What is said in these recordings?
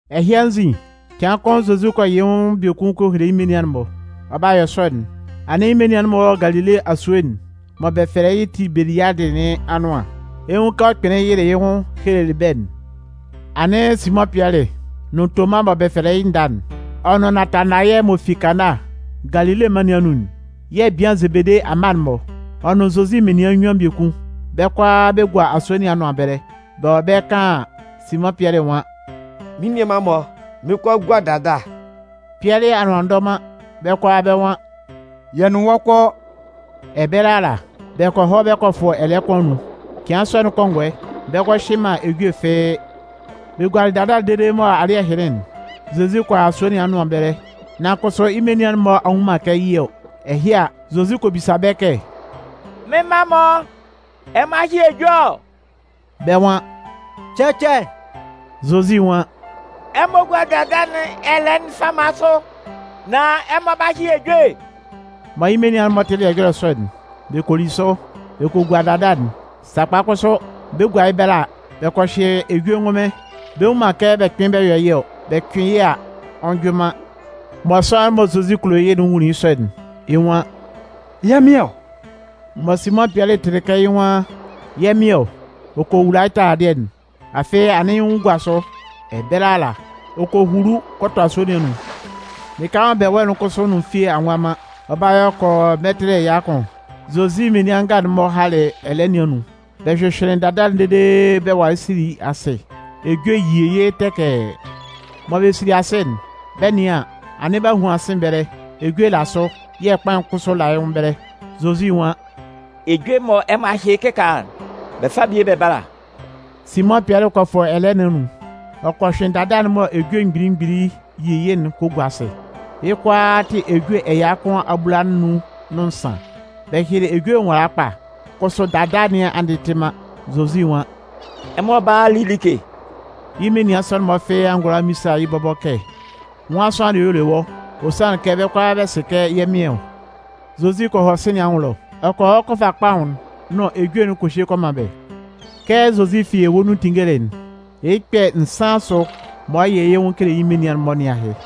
Ɛhɩ anzin, cɩan kʋn Zozi kɔ yɩ yɩ́ nwʋn biekun kɔ hele yɩ́ menian'n-mɔ. Ɔ 'ba yɔ sɔ'n, anɩn yɩ́ menian'n-mɔ wɔ Galile asue'n mɔ bɛ fɛlɛ yɩ́ Tibeliadɩ nɩn anʋan. Ɛ 'nwun kɛ ɔ kpɩnlɩn yɩlɩ yɩ́ nwʋn helelɩ bɛ́'n. Anɩn Simʋn Pɩɛlɩ nʋn Toma mɔ bɛ fɛlɛ yɩ́ Nda'n, ɔ nʋn Natanayɛ m'ɔ fi Kana, Galile mân nɩn anun'n yɛ̂ bian Zebede amma'n-mɔ, ɔ nʋn Zozi menian nnyuan biekun, bɛ́ kʋalaa bɛ gua asue nɩn anʋan ɛbɛlɛ. Bɛ wɔ ɛbɛlɛ kaan an, Simʋn Pɩɛlɩ nwan: “Mɩ́n nianman-mɔ, mɩn 'kɔ a gua dada.” Pɩɛlɩ anʋan a ndɔ man, bɛ́ kʋalaa bɛ́ nwan: “Yɛ nʋn wɔ́ kɔ.” Ɛbɛlɛ ala, bɛ kɔ hɔ bɛ kɔ fʋ ɛlɛɛ kʋn anun. Cɩan sɔ'n kɔngɔɛ, bɛ ngɔ hyɩ man ejue fɩ́ɩ́. Bɛ gualɩ dada'n dede mɔ alɩ́ɛ hɩnlɩn'n, Zozi kɔ a asue nɩn anʋan ɛbɛlɛ, nan kʋsʋ yɩ́ menian'n-mɔ a nnwun man kɛ yɩ́ ɔ. Ɛhɩ a, Zozi kɔ bisa bɛ́ kɛ: “Mɩ́n mma-mɔ, ɛmɔ a hyɩ ejue ɔ?” Bɛ́ nwan: “Cɛcɛ.” Zozi nwan: “Ɛmɔ gúa dada nɩn ɛlɛɛ'n fama sʋ, nán ɛmɔ 'ba hyɩ ejue.” Mɔ yɩ́ menian'n-mɔ tɩlɩ ɛjɔlɛ sɔ'n, bɛ kɔ li sʋ. Bɛ kɔ gua dada'n. Sakpa kʋsʋ, bɛ 'gua yɩ́ ɛbɛlɛ a, bɛ kɔ hyɩ ejue ngʋnmɩn, bɛ nnwun man kɛ bɛ kpɩn bɛ yɔ yɩ́ ɔ. Bɛ cʋɩn yɩ́ a, ɔ njʋɩn man. Mɔ sʋanlan'n mɔ Zozi kulo yɩ́'n nwunlin yɩ́ sɔ'n, yɩ́ nwan: “Yɛ́ Mɩn ɔ!” Mɔ Simʋn Pɩɛlɩ tɩlɩ kɛ yɩ́ nwan: “Yɛ́ Mɩn ɔ!”, ɔ kɔ wula yɩ́ taladɩɛ'n, afɩ anɩn yɩ́ nwʋn gua sʋ. Ɛbɛlɛ ala, ɔ kɔ hulu kɔ tɔ asue nɩn anun. Lɩka mɔ bɛ wɔ'n kʋsʋ nʋn fie a nwa man. Ɔ 'ba yɔ kɔ yɔ mɛtɩlɩ ɛya kʋn. Zozi menian nga'n-mɔ halɩ ɛlɛɛ nɩn anun, bɛ hyʋhyʋɩnlɩn dada'n dede bɛ walɩ sili asɩ, ejue yi yɩ́ tɛkɛɛ. Mɔ bɛ sili asɩ'n, bɛ 'nɩan an, anɩn b'a huan sɩ̂n ɛbɛlɛ, ejue la sʋ yɛ̂ kpaʋn kʋsʋ la yɩ́ nwʋn ɛbɛlɛ. Zozi nwan: “Ejue'n mɔ ɛmɔ a hyɩ yɩ́ kɩkaala'n, bɛ fá bie bɛ bála.” Simʋn Pɩɛlɩ kɔ fʋ ɛlɛɛ nɩn anun, ɔ kɔ hyʋɩn dada'n mɔ ejue mgbili mgbili yi yɩ́'n kɔ gua asɩ, Yɩ́ kʋalaa tɩ ejue ɛya kʋn abulanun nʋn nsan. Bɛ hyɩlɩ ejue nwala kpa, kʋsʋ dada nɩn a ndɩtɩ man. Zozi nwan: “Ɛmɔ bála a li like.” Yɩ́ menian sɔ'n-mɔ fɩ́ɩ́ a ngʋala a mmisa yɩ́ bɔbɔ kɛ: “Nwan sʋanlan dɩɛ y'ɔ le wɔ́?”, ɔ sanlɩn kɛ bɛ́ kʋalaa bɛ sɩ kɛ yɛ́ Mɩn ɔ. Zozi kɔ hɔ sɩ̂n nɩn anwʋn ɛlɔ, ɔ kɔ hɔ kɔ fa kpaʋn'n nʋn ejue'n kɔ hye kɔ man bɛ́. Kɛ Zozi fi ewue nun tinngelɩ'n, yɩ́ kpɛ̂ nsan asʋ mɔ ɔ 'yɩ yɩ́ nwʋn kele yɩ́ menian'n-mɔ nɩn ahɩ.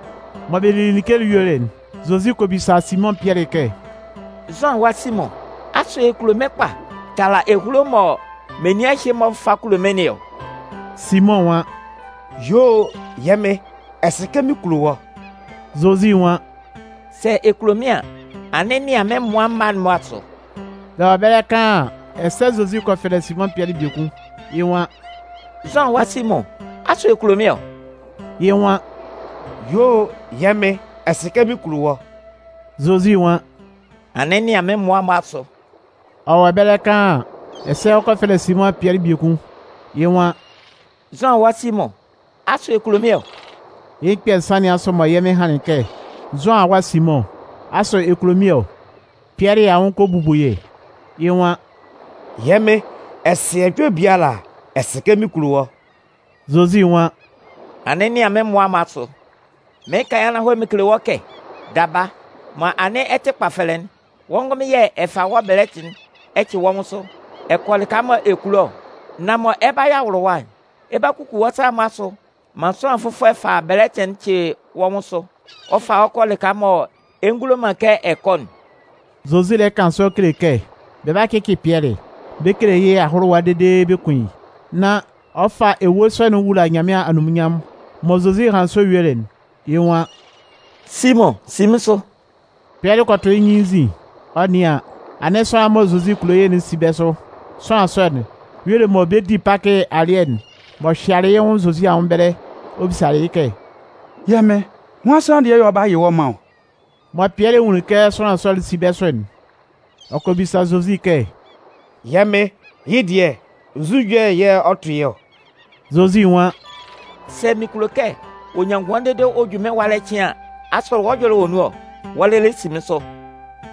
Mɔ bɛ lili like'n yuelɩ'n, Zozi kɔ bisa Simʋn Pɩɛlɩ kɛ: “Zʋan awa Simʋn, asʋ ɛ kulo mɩ́n kpa tala ehulo'n mɔ menian ɛhɩ-mɔ fa kulo mɩ́n nɩn ɔ?” Simʋn nwan: “Yuo o! Yɛ́ Mɩn, ɛ sɩ kɛ mɩn kulo wɔ́.” Zozi nwan: “Sɛ ɛ kulo mɩ́n an, anɩn nɩan mɩ́n mmʋa mma'n-mɔ asʋ.” Bɛ wɔ ɛbɛlɛ kaan an, ɛsɛ Zozi kɔ fɛlɛ Simʋn Pɩɛlɩ biekun, yɩ́ nwan: “Zʋan awa Simʋn, asʋ ɛ kulo mɩ́n ɔ?” Yɩ́ nwan: “Yuo o! Yɛ́ Mɩn, ɛ sɩ kɛ mɩn kulo wɔ́.” Zozi nwan: “Anɩn nɩan mɩ́n mmʋa'n-mɔ asʋ.” Ɔ wɔ ɛbɛlɛ kan an, ɛsɛ ɔ kɔ fɛlɛ Simʋn Pɩɛlɩ biekun, yɩ́ nwan: “Zʋan awa Simʋn, asʋ ɛ kulo mɩ́n ɔ?” Yɩ́ kpɛ̂ nsan nɩn asʋ mɔ Yɛ́ Mɩn hanlɩn kɛ: “Zʋan awa Simʋn, asʋ ɛ kulo mɩ́n ɔ?” Pɩɛlɩ anwʋn kɔ bubu yɩ́, yɩ́ nwan: “Yɛ́ Mɩn, ɛ sɩ ɛjɔlɛ biala, ɛ sɩ kɛ mɩn kulo wɔ́.” Zozi nwan: “Anɩn nɩan mɩ́n mmʋa'n-mɔ asʋ.” Mɩɩn kan yɩ́ ananhɔlɛ mɩn kele wɔ́ kɛ, daba, mɔ anɩn ɛ tɩ kpafɛlɛ'n, wɔ́ ngʋnmɩn yɛ̂ ɛ fa wɔ́ bɛlɛtɩ'n ɛ cɩ wɔ́ nwʋn sʋ, ɛ kɔ lɩka mɔ ɛ kulo ɔ. Nan mɔ ɛ 'ba yɔ awʋlʋwa'n, ɛ 'ba kuku wɔ́ sa'n-mɔ asʋ maan sʋanlan fʋfɔlɛ fa bɛlɛtɩ'n cɩ wɔ́ nwʋn sʋ, ɔ fa wɔ́ kɔ lɩka mɔ ɛ ngulo man kɛ ɛ kɔ'n. Zozi lɛ kan sɔ kele kɛ bɛ 'ba cɩcɩ Pɩɛlɩ, bɛ kele yɩ́ ahʋlʋwa dede bɛ kun yɩ́, nán ɔ fa ewue sɔ'n ɔ wula Nyanmɩan anunminnyanmʋn. Mɔ Zozi hanlɩn sɔ yuelɩ'n, yɩ́ nwan: “Simʋn, si mɩ́n sʋ!” Pɩɛlɩ kɔ tʋ yɩ́ nyɩn yɩ́ nzin, ɔ 'nɩan an, anɩn sʋanlan'n mɔ Zozi kulo yɩ́'n si bɛ́ sʋ. Sʋanlan sɔ'n y'ɔ le mɔ bɛ 'di Pakɩ alɩɛ'n m'ɔ hyɩalɩ yɩ́ nwʋn Zozi anwʋn ɛbɛlɛ ɔ bisalɩ yɩ́ kɛ: “Yɛ́ Mɩn, nwan sʋanlan dɩɛ yɛ̂ ɔ 'ba yɩ wɔ́ man ɔ?”. Mɔ Pɩɛlɩ nwunlin kɛ sʋanlan sɔ'n si bɛ́ sʋ'n, ɔ kɔ bisa Zozi kɛ: “Yɛ́ Mɩn, yɩ́ dɩɛ, nzu ɛjɔlɛ yɛ̂ ɔ 'tʋ yɩ́ ɔ?” Zozi nwan: “Sɛ mɩn kulo kɛ ɔ nyan ngʋan dede ɔ ju mɩ́n ɛwalɛ cɩan an, asʋ wɔ́ ɛjɔlɛ wɔ nun ɔ? Wɔ́ lɩlɩ si mɩ́n sʋ!”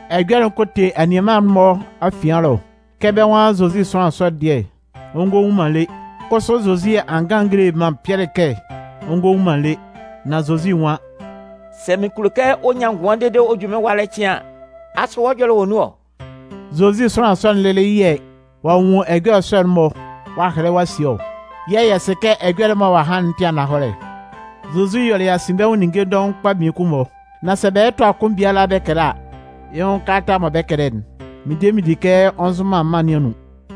Ɛjɔlɛ'n kɔ te anianman'n-mɔ afian ɛlɔ kɛ bɛ́ nwan Zozi sʋanlan sɔ'n dɩɛ ɔ ngɔ wu man lé. Kʋsʋ Zozi a ngan a ngele man Pɩɛlɩ kɛ ɔ ngɔ wu man le, nan Zozi nwan: “Sɛ mɩn kulo kɛ ɔ nyan ngʋan dede ɔ ju mɩ́n ɛwalɛ cɩan an, asʋ wɔ́ ɛjɔlɛ wɔ nun ɔ?” Zozi sʋanlan sɔ'n lɩlɩ yɛ̂ ɔ'a nwun ɛjɔlɛ sɔ'n-mɔ ɔ'a hɛlɛ ɔ'a sie ɔ. Yɛ̂ yɛ sɩ kɛ ɛjɔlɛ'n mɔ ɔ'a han'n tɩ ananhɔlɛ. Zozi yɔlɩ asinbɛnwʋn ninnge dɔʋn kpa mmiekun-mɔ. Nan sɛ bɛ lɛ tʋa kʋn biala bɛ kɛlɛ a, yɩ́ nwʋn kalata mɔ bɛ 'kɛlɛ'n, mɩn de mɩn di kɛ ɔ nzʋn man mân nɩn anun.